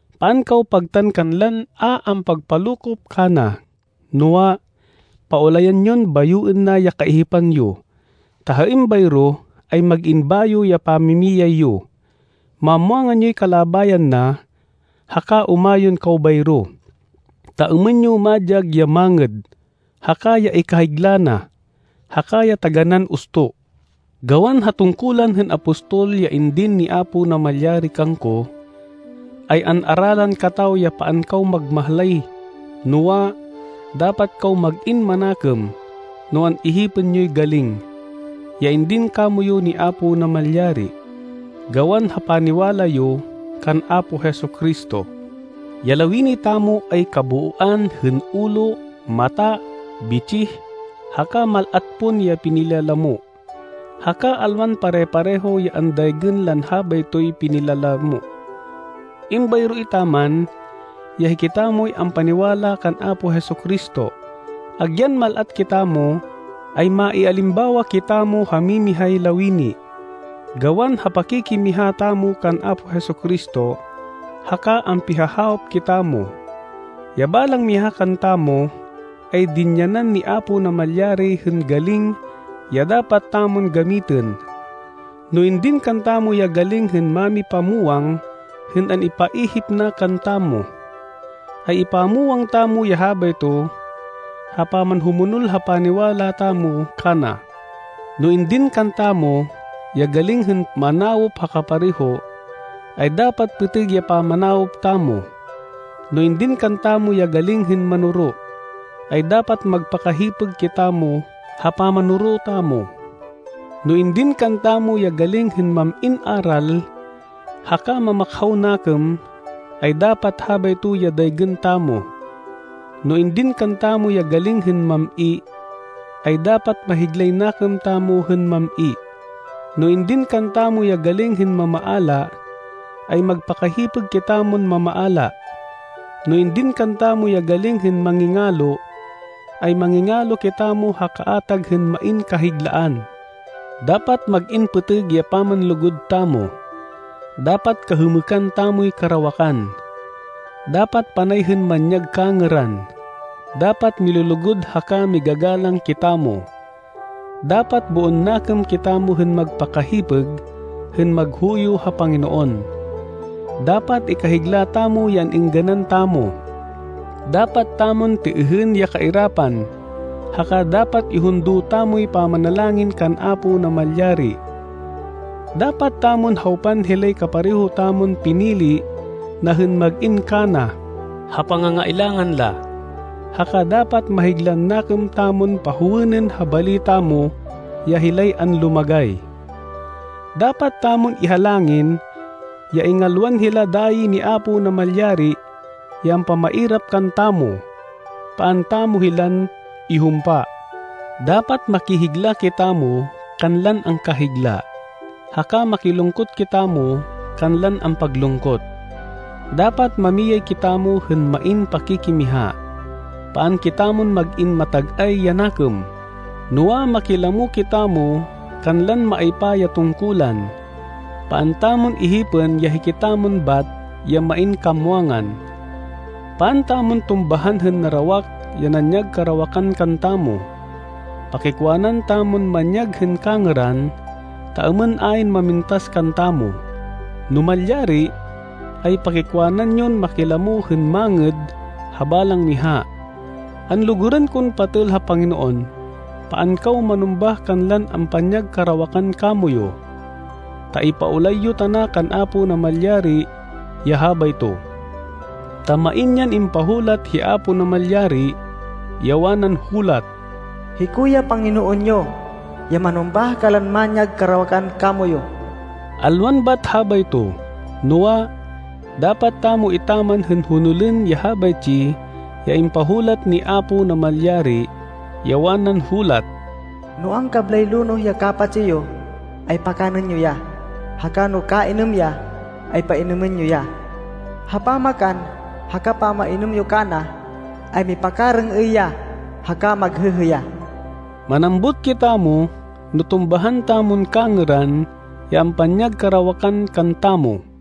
Paan kaw pagtan kanlan a ampagpalokop kana, noa, paulayan yon bayoên na ya kaihipan yo, ta ha êmbayro ay mag-in bayo ya pamimiyay yo. Mamwangan yoy kalabayan na haka umayon kaw bayro, ta êmên yo madyag ya mangêd, haka ya ikahigla na, haka ya taganán usto. Gawan ha tungkulan hên apostol ya indin ni Apo Namalyari kangko, ay an-aralan kataw ya paan kaw magmahlay, noa, dapat kaw mag-in manakêm no an-ihipên yoy galing, ya indin kamoyu ni Apo Namalyari, gawan ha paniwala yo kan Apo Jesu-Cristo. Ya lawini tamo ay kabooan hên ulo, mata, bitsih, haka mal-at pon ya pinilalamo, haka alwan pare-pareho ya andaygên lan habaytoy pinilalamo. Êmbayro etaman ya hikitamoy ampaniwala kan Apo Jesu-Cristo, agyan mal-at kitamo, ay maialimbawa kitamo ha mimihay lawini, gawan ha pakikimiha tamo kan Apo Jesu-Cristo, haka ampihahawop kitamo. Ya balang miha kantamo, ay dinyanan ni Apo Namalyari hên galing ya dapat tamon gamitên. No indin kantamo ya galing hên mamipamwang hên an-ipaihip na kantamo, ay ipamwang tamo ya habayto ha pamanhumonol ha paniwala tamo kana. No indin kantamo ya galing hên manawop ha kapareho, ay dapat pêtêg ya pamanawop tamo. No indin kantamo ya galing hên manoro, ay dapat magpakahipêg kitamo ha pamanoro tamo. No indin kantamo ya galing hên mam-in aral, haka mamakhaw nakêm, ay dapat habayto ya daygên tamo. No indin kantamo ya galing hên mam-i, ay dapat mahiglay nakêm tamo hên mam-i. No indin kantamo ya galing hên mamaala, ay magpakahipêg kitamon mamaala. No indin kantamo ya galing hên mangingalo, ay mangingalo kitamo ha kaatag hên main kahiglaan. Dapat mag-in pêtêg ya pamanlugud tamo. Dapat kahêmêkan tamoy karawakan. Dapat panay hên manyag kangêran. Dapat milulugud haka migagalang kitamo. Dapat boon nakêm kitamo hên magpakahipêg hên maghuyo ha Panginoon. Dapat ikahigla tamo ya an-êngganan tamo, dapat tamon têêhên ya kairapan, haka dapat ihundo tamoy pamanalangin kan Apo Namalyari. Dapat tamon hawpan hilay kapareho tamon pinili na hên mag-in kana ha pangangailangan la, haka dapat mahiglan nakêm tamon pahowênên ha bali tamo ya hilay anlumagay. Dapat tamon ihalangin ya ingalwan hila dayi ni Apo Namalyari ya ampamairap kantamo. Paan tamo hilan ihumpa. Dapat makihigla kitamo kanlan angkahigla, haka makilungkot kitamo kanlan ampaglungkot. Dapat mamiyay kitamo hên main pakikimiha. Paan kitamon mag-in matag-ay ya nakêm, noa, makilamo kitamo kanlan maaypa ya tungkulan. Paan tamon ihipên ya hikitamon bat ya main kamwangan. Paan tamon tumbahan hên narawak ya nanyag karawakan kantamo. Pakikwanan tamon manyag hên kangêran, ta êmên ayn mamintas kantamo. No malyari, ay pakikwanan yon makilamo hên mangêd ha balang miha. Anlugurên kon patêl ha Panginoon, paan kaw manumbah kanlan ampanyag karawakan kamoyu, ta ipaulay yo tana kan Apo Namalyari ya habayto. Ta main yan impahulat hi Apo Namalyari, ya wanan hulat, “Hiko ya Panginoon yo ya manumbah kanlan manyag karawakan kamoyu.” Alwan bat habayto, noa, dapat tamo etaman hên honolên ya habaytsi ya impahulat ni Apo Namalyari, ya wanan hulat, “No angkablay lonoh ya kapatsi yo, ay pakanên yo ya, haka no kainêm ya, ay painêmên yo ya. Ha pamakan haka pamainêm yo kana, ay mipakarêng-êy ya haka maghêhê ya.” Manambut kitamo no tumbahan tamon kangêran ya ampanyag karawakan kantamo.